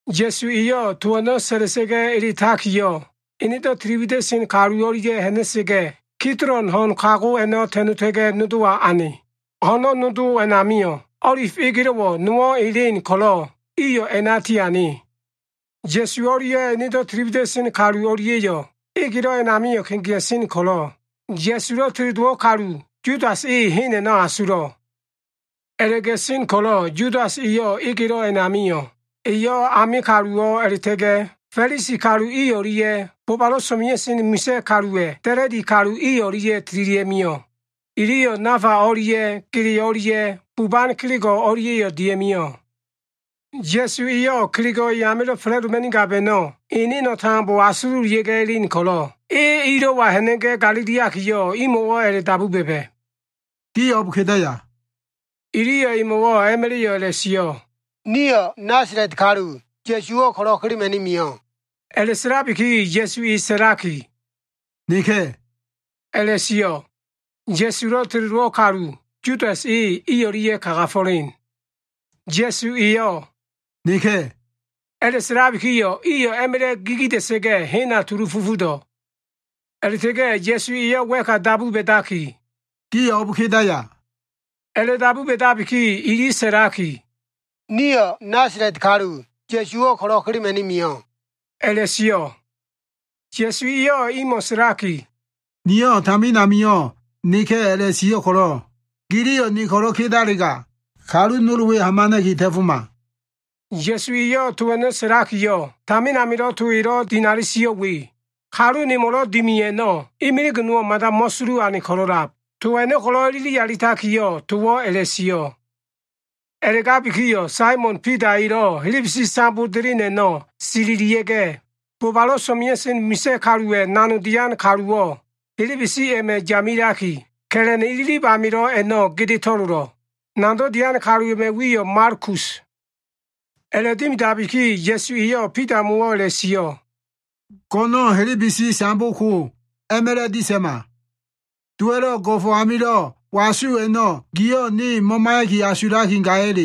Ya꞉su eyo꞉ to a꞉no꞉ sa꞉la꞉sa꞉ga꞉ eletakiyo꞉, enedo꞉ tili wida꞉sen kalu o꞉lia꞉ ha꞉na꞉sa꞉ga꞉, Kidolon ho꞉n kago a꞉no꞉ ta꞉ta꞉ga꞉, nodowa ane. Ho꞉no꞉ nodo a꞉namio꞉, o꞉lif egelo꞉ nowo꞉ elen ko꞉lo꞉ iyo꞉ a꞉na tiane. Ya꞉su o꞉lia꞉ enedo꞉ tili wida꞉sen kalu i o꞉lia꞉yo꞉ egelo꞉ a꞉namio꞉ kegea꞉sen ko꞉lo꞉ Ya꞉sulo꞉ teledowo꞉ kalu Yudas eyo꞉ hen a꞉no꞉ asulo꞉. A꞉la꞉ga꞉sen ko꞉lo꞉ Yudas e egelo꞉ a꞉na mio꞉. Eyo꞉ ame kaluwo꞉ a꞉la꞉ta꞉ga꞉ Fa꞉lisi o꞉lia꞉ bobalo꞉ so꞉mea꞉sen misa꞉ kaluwa꞉ da꞉la꞉di kalu i o꞉lia꞉ tililia꞉ mio꞉. Iliyo꞉ nafa o꞉lia꞉ gele o꞉lia꞉ buban kelego꞉ o꞉lia꞉yo꞉ dia꞉mio꞉. Ya꞉su eyo꞉ kelego꞉ e amilo꞉ fa꞉la꞉doma꞉nigab a꞉no꞉ eneno꞉ tambo asululia꞉ga꞉ elen ko꞉lo꞉, e ilo꞉wa ha꞉na꞉ga꞉ galiliakiyo꞉, imo꞉wo꞉ a꞉la꞉dabu ba꞉ba꞉, “Gio꞉ o꞉b kedaya?” Iliyo꞉ emo꞉wo꞉ a꞉ma꞉la꞉yo꞉ a꞉la꞉sio꞉, “Nasala꞉t kalu, Ya꞉suwo꞉ ko꞉lo꞉ kelema꞉ni mio꞉.” A꞉la꞉sa꞉labiki Ya꞉su e sa꞉laki, “Neka꞉” a꞉la꞉sio꞉. Ya꞉sulo꞉ teledowo꞉ kalu, Yudas e i o꞉lia꞉ kagafo꞉len. Ya꞉su eyo꞉ “Neka꞉” a꞉la꞉sa꞉labikiyo꞉, iyo꞉ a꞉ma꞉la꞉ gigida꞉sa꞉ga꞉, hena tulu fufudo꞉. A꞉la꞉ta꞉ga꞉ Ya꞉su eyo꞉ wa꞉ka dabu ba꞉dakiyo꞉, “Gio꞉ o꞉b kedaya?” A꞉la꞉dabu ba꞉dabiki, ili sa꞉lakiyo꞉, “Nasala꞉t kalu, Ya꞉suwo꞉ ko꞉lo꞉ kelema꞉ni mio꞉” a꞉la꞉sio꞉. Ya꞉su eyo꞉ imo꞉ sa꞉laki, “Niyo꞉ tamin amio꞉ Neka꞉ a꞉la꞉sio꞉ ko꞉lo꞉, giliyo꞉ ne ko꞉lo꞉ kedalega, kalu nol we hamana꞉ki ta꞉foma.” Ya꞉su eyo꞉ to a꞉no꞉ sa꞉lakiyo꞉, tamin amilo꞉ to elo꞉ dinali sio꞉ we, “Kalu nemo꞉lo꞉ dimi a꞉no꞉, imilig nowo꞉ mada mo꞉sulu ane ko꞉lo꞉lab” to a꞉no꞉ ko꞉lo꞉ ilili alitakiyo꞉, towo꞉ a꞉la꞉sio꞉. A꞉la꞉gabikiyo꞉ Saimon Bida elo꞉ helebesi sambo delen a꞉no꞉ sililia꞉ga꞉, bobalo꞉ so꞉mea꞉sen misa꞉ kaluwa꞉ nanogdo꞉ dian kalu a꞉no꞉ helebesi a꞉ma꞉ yamelaki, ka꞉la꞉n ililib amilo꞉ a꞉no꞉ gede to꞉lolo꞉. Nanogdo꞉ dian kalu a꞉ma꞉ wiyo꞉ Malkus. A꞉la꞉dimidabiki Ya꞉su eyo꞉ Bidamo꞉wo꞉ a꞉la꞉sio꞉, “Go꞉no꞉n helebesi sambo ko a꞉ma꞉la꞉ disa꞉ma. Dowa꞉lo꞉ go꞉fo꞉ amilo꞉ wasu a꞉no꞉ giyo꞉ ne mo꞉maiya꞉ki gaya?”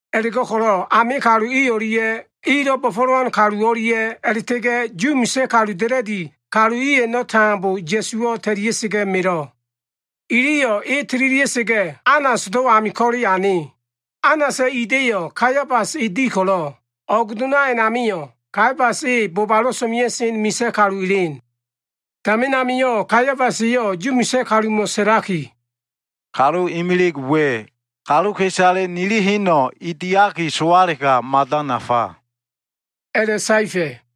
A꞉la꞉go꞉ko꞉lo꞉ ame kalu i o꞉lia꞉ ilo꞉ bo꞉fo꞉lowan kalu o꞉lia꞉ a꞉la꞉ta꞉ga꞉ Yu misa꞉ kaluwa꞉ da꞉la꞉di kalu i a꞉no꞉ tambo Ya꞉suwo꞉ ta꞉lia꞉sa꞉ga꞉ melo꞉. Iliyo꞉ e tililia꞉sa꞉ga꞉, Anasdo꞉ ami ko꞉le ane. Anasa꞉ ida꞉yo꞉ Kaiafas e di ko꞉lo꞉, o꞉g dona a꞉namio꞉, Kaiafas e bobalo꞉ so꞉mea꞉sen misa꞉ kalu elen. Tamin amio꞉ Kaiafas eyo꞉ Yu misa꞉ kalumo꞉ sa꞉laki, “Kalu imilig we, kaluka꞉isale nililo꞉ma꞉ heno꞉ e diaki sowalega, mada nafa” a꞉la꞉saefa꞉.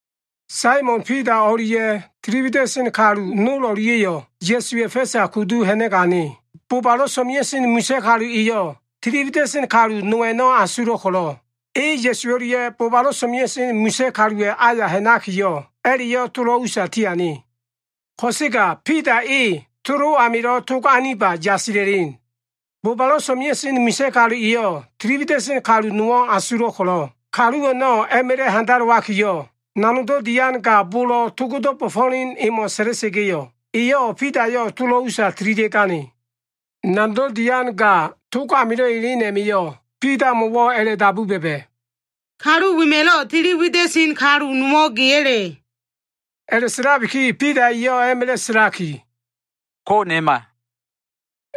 Saimon Bida o꞉lia꞉ tili wida꞉sen kalu no o꞉lia꞉yo꞉ Ya꞉suwa꞉ fa꞉sa kudu ha꞉na꞉ga꞉ ane. Bobalo꞉ so꞉mea꞉sen misa꞉ kalu eyo꞉ tili wida꞉sen kalu no a꞉no꞉ asulo꞉ ko꞉lo꞉, e Ya꞉su o꞉lia꞉ bobalo꞉ so꞉mea꞉sen misa꞉ kaluwa꞉ aya ha꞉nakiyo꞉, a꞉la꞉yo꞉ tolo꞉ usa tiane. Ko꞉sega Bida e tolo꞉ amilo꞉ tog aniba yasila꞉len. Bobalo꞉ so꞉mea꞉sen misa꞉ kalu eyo꞉ tili wida꞉sen kalu nowo꞉ asulo꞉ ko꞉lo꞉, kalu a꞉no꞉ a꞉ma꞉la꞉ handalowakiyo꞉, nanogdo꞉ dian ga bolo꞉ togdo꞉ bo꞉fo꞉len emo꞉ sa꞉la꞉sa꞉ga꞉yo꞉, eyo꞉ Bidayo꞉ tolo꞉ usa tililia꞉gane. Nanogdo꞉ dian ga tog amilo꞉ elen a꞉ma꞉yo꞉ Bidamo꞉wo꞉ a꞉la꞉dabu ba꞉ba꞉, “Kalu wema꞉lo꞉ tili wida꞉sen kalu nowo꞉ geya꞉le?” A꞉la꞉sa꞉labiki Bida eyo꞉ a꞉ma꞉la꞉ sa꞉laki, “Ko꞉ nema”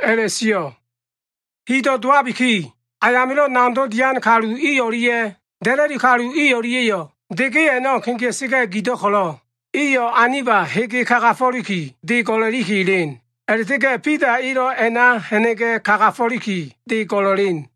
a꞉la꞉sio꞉. Hido꞉ dowabiki, ayamilo꞉ nanogdo꞉ dian kalu i o꞉lia꞉ da꞉la꞉di kalu i o꞉lia꞉yo꞉ de ge a꞉no꞉ kegea꞉sa꞉ga꞉ gido꞉ ko꞉lo꞉, iyo꞉ aniba hege kagafo꞉liki, de go꞉la꞉liki elen. A꞉la꞉ta꞉ga꞉ Bida elo꞉ a꞉na ha꞉na꞉ga꞉ kagafo꞉liki, de go꞉la꞉len.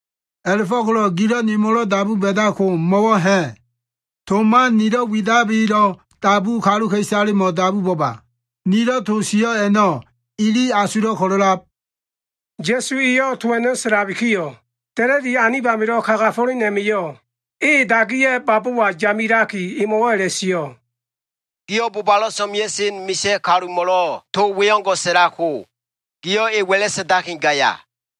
A꞉la꞉fo꞉ko꞉lo꞉ gilo꞉ nemo꞉lo꞉ dabu ba꞉dab ko mo꞉wo꞉ ha꞉? To man nilo꞉ widabilo꞉ dabu kaluka꞉isalemo꞉ dabu bo꞉ba. Nilo꞉ to sio꞉ a꞉no꞉ ili asulo꞉ ko꞉lo꞉lab.” Ya꞉su eyo꞉ to a꞉no꞉ sa꞉labikiyo꞉, da꞉la꞉di kalu anib amilo꞉ kagafo꞉len a꞉ma꞉yo꞉ e dagiya꞉ babowa yamelaki, emo꞉wo꞉ a꞉la꞉sio꞉, “Giyo꞉ bobalo꞉ so꞉mea꞉sen misa꞉ kalumo꞉lo꞉ to we o꞉ngo꞉ sa꞉lab ko, giyo꞉ e wa꞉la sa꞉ndaki gaya?”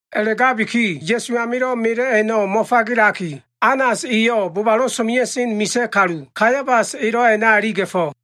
A꞉la꞉gabiki Ya꞉su amilo꞉ melo꞉ a꞉no꞉ mo꞉fagelaki, Anas eyo꞉ bobalo꞉ so꞉mea꞉sen misa꞉ kalu, Kaiafas elo꞉ a꞉na iliga꞉fo꞉.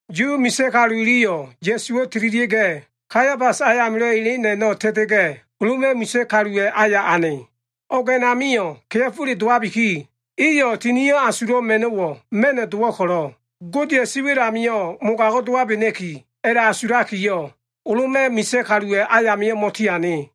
Yu misa꞉ kalu iliyo꞉ Ya꞉suwo꞉ tililia꞉ga꞉, Kaiafasa꞉ ayamilo꞉ elen a꞉no꞉ ta꞉ta꞉ga꞉, Loma꞉ misa꞉ kaluwa꞉ aya ane. O꞉g a꞉namio꞉ kea꞉fole dowabiki, iyo꞉ Tinio꞉ Asulo꞉ ma꞉no꞉wo꞉ ma꞉no꞉ dowo꞉ ko꞉lo꞉, Godeya꞉ siwa꞉l amio꞉ mogago꞉ dowabena꞉ki a꞉la꞉asulakiyo꞉, Loma꞉ misa꞉ kaluwa꞉ ayamio꞉ mo꞉tiane.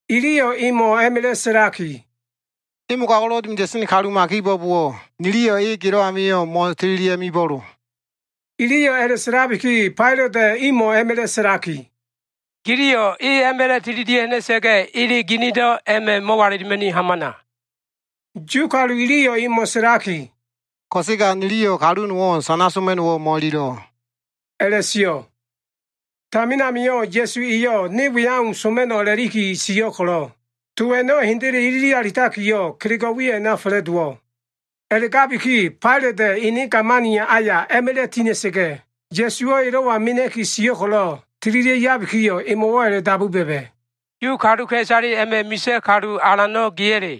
Iliyo꞉ emo꞉ a꞉ma꞉la꞉ sa꞉laki, “E mogago꞉lo꞉ dimida꞉sen kaluma kibo꞉bowo꞉ niliyo꞉ e gelo꞉ amio꞉ mo꞉tililia꞉ga꞉ mibo꞉lo.” Iliyo꞉ a꞉la꞉sa꞉labiki, Failata꞉ imo꞉ a꞉ma꞉la꞉ sa꞉laki, “Giliyo꞉ e a꞉ma꞉la꞉ tililia꞉ ha꞉na꞉sa꞉ga꞉, ele ginido꞉ a꞉ma꞉ mo꞉walilima꞉ni hamana.” Yu kalu iliyo꞉ emo꞉ sa꞉laki, “Ko꞉sega niliyo꞉ kalu nowo꞉ sana soma꞉no꞉wo꞉ mo꞉ililo꞉” a꞉la꞉sio꞉. Tamin amio꞉ Ya꞉su eyo꞉ ne we au soma꞉no꞉ a꞉la꞉liki sio꞉ ko꞉lo꞉, to a꞉no꞉ hendele ilili alitakiyo꞉ kelego꞉ we a꞉na fa꞉la꞉dowo꞉. A꞉la꞉gabiki Failata꞉ ene gamani aya a꞉ma꞉la꞉ tina꞉sa꞉ga꞉, Ya꞉suwo꞉ elo꞉wa mena꞉ki sio꞉ ko꞉lo꞉, tililia꞉ yabikiyo꞉ emo꞉wo꞉ a꞉la꞉dabu ba꞉ba꞉, “Yu kaluka꞉isale a꞉ma꞉ misa꞉ kalu alano꞉ geya꞉le?”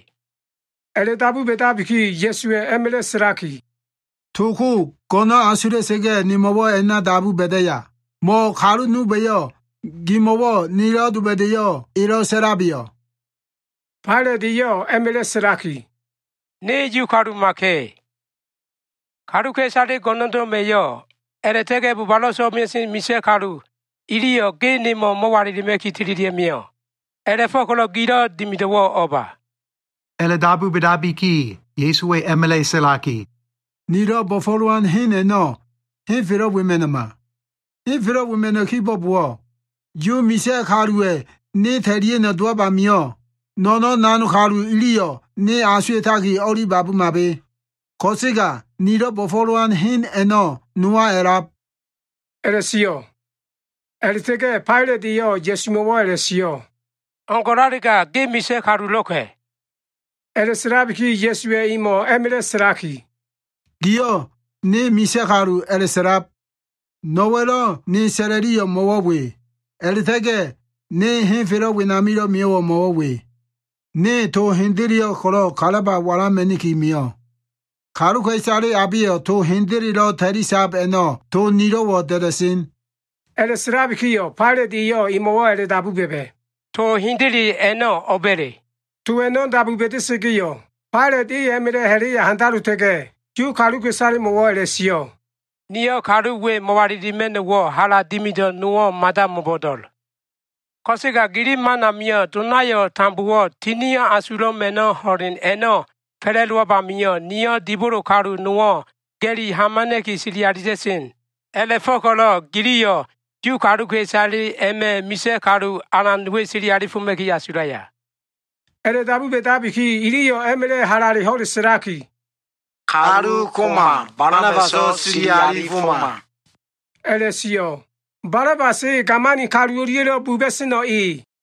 A꞉la꞉dabu ba꞉dabiki Ya꞉suwa꞉ a꞉ma꞉la꞉ sa꞉laki, “To ko go꞉no꞉n asula꞉sa꞉ga꞉ nemo꞉wo꞉ a꞉na dabu ba꞉daya, mo꞉ kalu nolba꞉yo꞉ gimo꞉wo꞉ nelo꞉ doba꞉da꞉yo꞉ elo꞉ sa꞉labeyo꞉?” Failat eyo꞉ a꞉ma꞉la꞉ sa꞉laki, “Ne Yu kalumaka꞉. Kaluka꞉isale go꞉no꞉ndo꞉ma꞉yo꞉ a꞉la꞉ta꞉ga꞉ bobalo꞉ so꞉mea꞉sen misa꞉ kalu iliyo꞉ ge nemo꞉ mo꞉walilima꞉ki tililia꞉ mio꞉. A꞉la꞉fo꞉ko꞉lo꞉ gilo꞉ dimido꞉wo꞉ o꞉ba?” A꞉la꞉dabu ba꞉dabiki Ya꞉suwa꞉ a꞉ma꞉la꞉ sa꞉laki, “Nilo꞉ bo꞉fo꞉lowan hen a꞉no꞉ henfelo꞉ wema꞉no꞉ma. Henfelo꞉ wema꞉no꞉ kibo꞉bowo꞉, Yu misa꞉ kaluwa꞉ ne ta꞉lia꞉no꞉ dowab amio꞉, no꞉no꞉n nanog kalu iliyo꞉ ne asuwa꞉taki o꞉li babumabe. Ko꞉sega nilo꞉ bo꞉fo꞉lowan hen a꞉no꞉ nowa a꞉lab,” a꞉la꞉sio꞉. A꞉la꞉ta꞉ga꞉ Failat eyo꞉ Ya꞉sumo꞉wo꞉ a꞉la꞉sio꞉, “O꞉ngo꞉lalega ge misa꞉ kalulo꞉ka꞉.” A꞉la꞉sa꞉labiki Ya꞉suwa꞉ emo꞉ a꞉ma꞉la꞉ sa꞉laki, “Giyo꞉ ne misa꞉ kalu a꞉la꞉sa꞉lab. No꞉wa꞉lo꞉ ne sa꞉la꞉liyo꞉ mo꞉wo꞉ we, a꞉la꞉ta꞉ga꞉ ne henfelo꞉ wenamilo꞉ mio꞉wo꞉ mo꞉wo꞉ we. Ne to hendeleyo꞉ ko꞉lo꞉ kalaba walama꞉niki mio꞉. Kaluka꞉isale abeyo꞉ to hendelelo꞉ ta꞉lisab a꞉no꞉ to nilo꞉wo꞉ da꞉da꞉sen.” A꞉la꞉sa꞉labikiyo꞉ Failat eyo꞉ emo꞉wo꞉ a꞉la꞉dabu ba꞉ba꞉, “To hendele a꞉no꞉ o꞉ba꞉le?” To a꞉no꞉ dabu ba꞉da꞉sa꞉ga꞉yo꞉, Failat e a꞉ma꞉la꞉ ha꞉la꞉ya handalota꞉ga꞉, Yu kaluka꞉isalemo꞉wo꞉ a꞉la꞉sio꞉, “Niyo꞉ kalu we mo꞉walilima꞉no꞉wo꞉ hala dimido꞉ nowo꞉ mada mo꞉bo꞉do꞉l. Ko꞉sega gili man amio꞉, donayo꞉ tambowo꞉ Tinio꞉ Asulo꞉ Ma꞉no꞉ ho꞉len a꞉no꞉ fa꞉la꞉dowab amio꞉, niyo꞉ dibolo kalu nowo꞉ ga꞉li hamana꞉ki sili alita꞉sen. A꞉la꞉fo꞉ko꞉lo꞉ giliyo꞉ Yu kaluka꞉isale a꞉ma꞉ misa꞉ kalu alan we sili alifoma꞉ki asulaya?” A꞉la꞉dabu ba꞉dabiki iliyo꞉ a꞉ma꞉la꞉ halale ho꞉le sa꞉laki, “Kalu koma. Balabaso꞉ sili alifoma” a꞉la꞉sio꞉. Balabas e gamani o꞉lia꞉lo꞉ buba꞉sen kaluwo꞉ e.